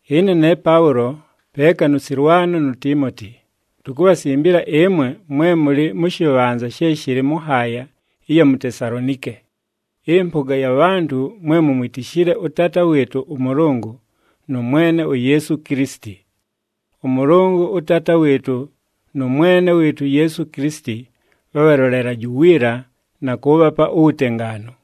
Ɨne ne Paʉlo, peeka nʉ Sɨlwano nu Tiimoti, tukubhasimbila ɨmwe mwe mʉlɨ mʉ shɨbhanza she shɨlɨ mʉ nhaaya ɨya mu Tesalonike, ɨmpʉga ya bhantʉ mwe mumwitishile ʉTaata wɨɨtʉ ʉMʉlʉngʉ nʉ Mwene uYeesu Kilisiti. ɄMʉlʉngʉ ʉTaata wɨɨtʉ nʉ Mwene wɨɨtʉ uYeesu Kilisiti bhabhalolelaje uwiila na kʉʉbhapa uwutengaanu.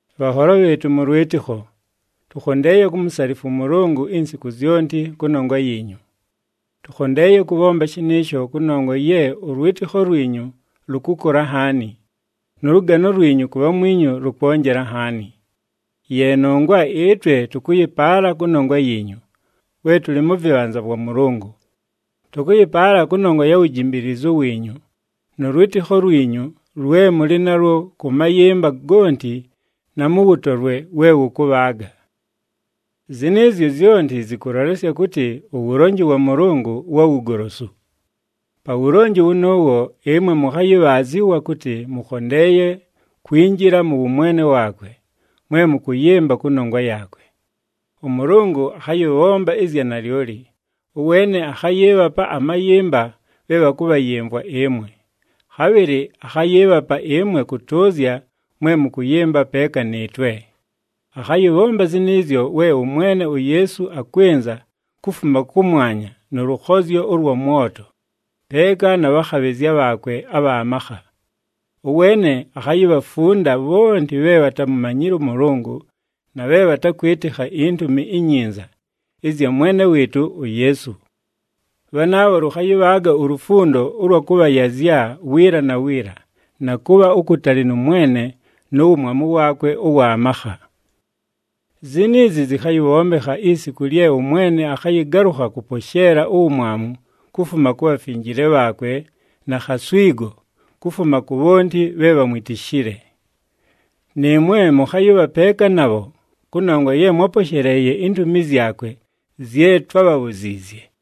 Bhanholo bhɨɨtʉ mʉ lwɨtɨkho, tʉkhondeeye kumusalifwa ʉMʉlʉngʉ insiku zyonti kʉnongwa yiinyu. Tʉkhondeeye kʉbhomba shɨnɨɨsho kʉnongwa ye ʉlwɨtɨkho lwinyu lʉkʉkʉla nhaani, nʉ lʉgano lwinyu ku bhamwinyu lʉkwonjela nhaani. Ye nongwa ɨtwe tʉkʉyɨpaala kʉnongwa yiinyu, we tʉlɨ mʉ vɨbhanza vwa Mʉlʉngʉ. Tʉkʉyɨpaala kʉnongwa ya wujimbiilizu wiinyu nʉ lwɨtɨkho lwinyu lwe mʉlɨ nalwo kʉ mayɨmba gonti na mʉ wʉtolwe we wʉkʉbhaaga. Zɨnɨɨzyo zyonti zɨkʉlolesya kʉtɨ uwulonji wa Mʉlʉngʉ wa wugolosu. Pa wulonji wʉnʉʉwo ɨmwe mʉkhayɨbhaazɨwa kʉtɨ mʉkhondeeye kwinjila mʉ wʉmwene waakwe, mwe mʉkʉyɨmba kʉnongwa yaakwe. ɄMʉlʉngʉ akhayɨbhomba ɨzya nalyoli, ʉweene akhayɨɨbhapa amayɨmba bhe bhakʉbhayɨmvwa ɨmwe. Khabhɨlɨ akhayɨɨbhapa ɨmwe kʉtʉʉzya mwe mʉkʉyɨmba peeka nɨɨtwe. Akhayɨbhomba zɨnɨɨzyo we ʉMwene uYeesu akwɨnza kufuma kʉmwanya nʉ lʉkhozyo ʉlwa mwoto, peeka na bhakhabhɨzya bhaakwe abha makha. Ʉweene akhayibhafunda bhonti bhe bhatamumanyile ʉMʉlʉngʉ na bhe bhatakwɨtɨkha iNtumi iNyinza ɨzya Mwene wɨɨtʉ uYeesu. Bhanaabho lʉkhayɨbhaaga ulufundo ʉlwa kʉbhayazya wiila na wiila na kʉbha ukutali nʉ Mwene nu wumwamu waakwe ʉwa makha. Ziniizi zɨkhayɨbhombekha isiku lye ʉMwene akhayɨgalʉkha kʉposheela uwumwamu kufuma ku bhafinjile bhaakwe na khaswigo kufuma ku bhonti bhe bhamwitishile. Nɨɨmwe mʉkhayɨbha peeka nabho kʉnongwa ye mwáposheleeye intumi zyakwe zye twábhabhuziizye.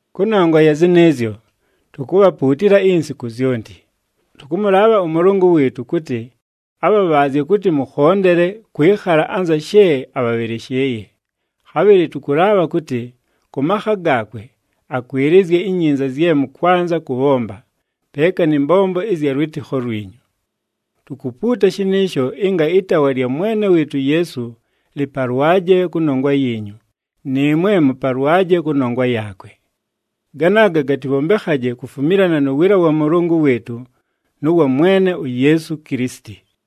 Kʉnongwa ya zɨnɨɨzyo, tukubhapuutila insiku zyonti. Tʉkʉmʉlaabha ʉMʉlʉngʉ wɨɨtʉ kʉtɨ abhabhaazye kʉtɨ mʉkhondele kwɨkhala anza she abhabhɨlɨshɨɨye. Khabhɨlɨ tʉkʉlaabha kʉtɨ kʉ makha gaakwe, akwɨlɨzye inyinza zye mʉkwanza kʉbhomba, peeka nɨ mbombo ɨzya lwɨtɨkho lwinyu. Tukupuuta shɨnɨɨsho ɨnga ɨtaawa lya Mwene wɨɨtʉ uYeesu lɨpalwaje kʉnongwa yiinyu, nɨɨmwe mʉpalwaje kʉnongwa yaakwe. Ganaaga gatɨbhombekhaje kufumilana nu wiila wa Mʉlʉngʉ wɨɨtʉ nʉ wa Mwene uYeesu Kilisiti.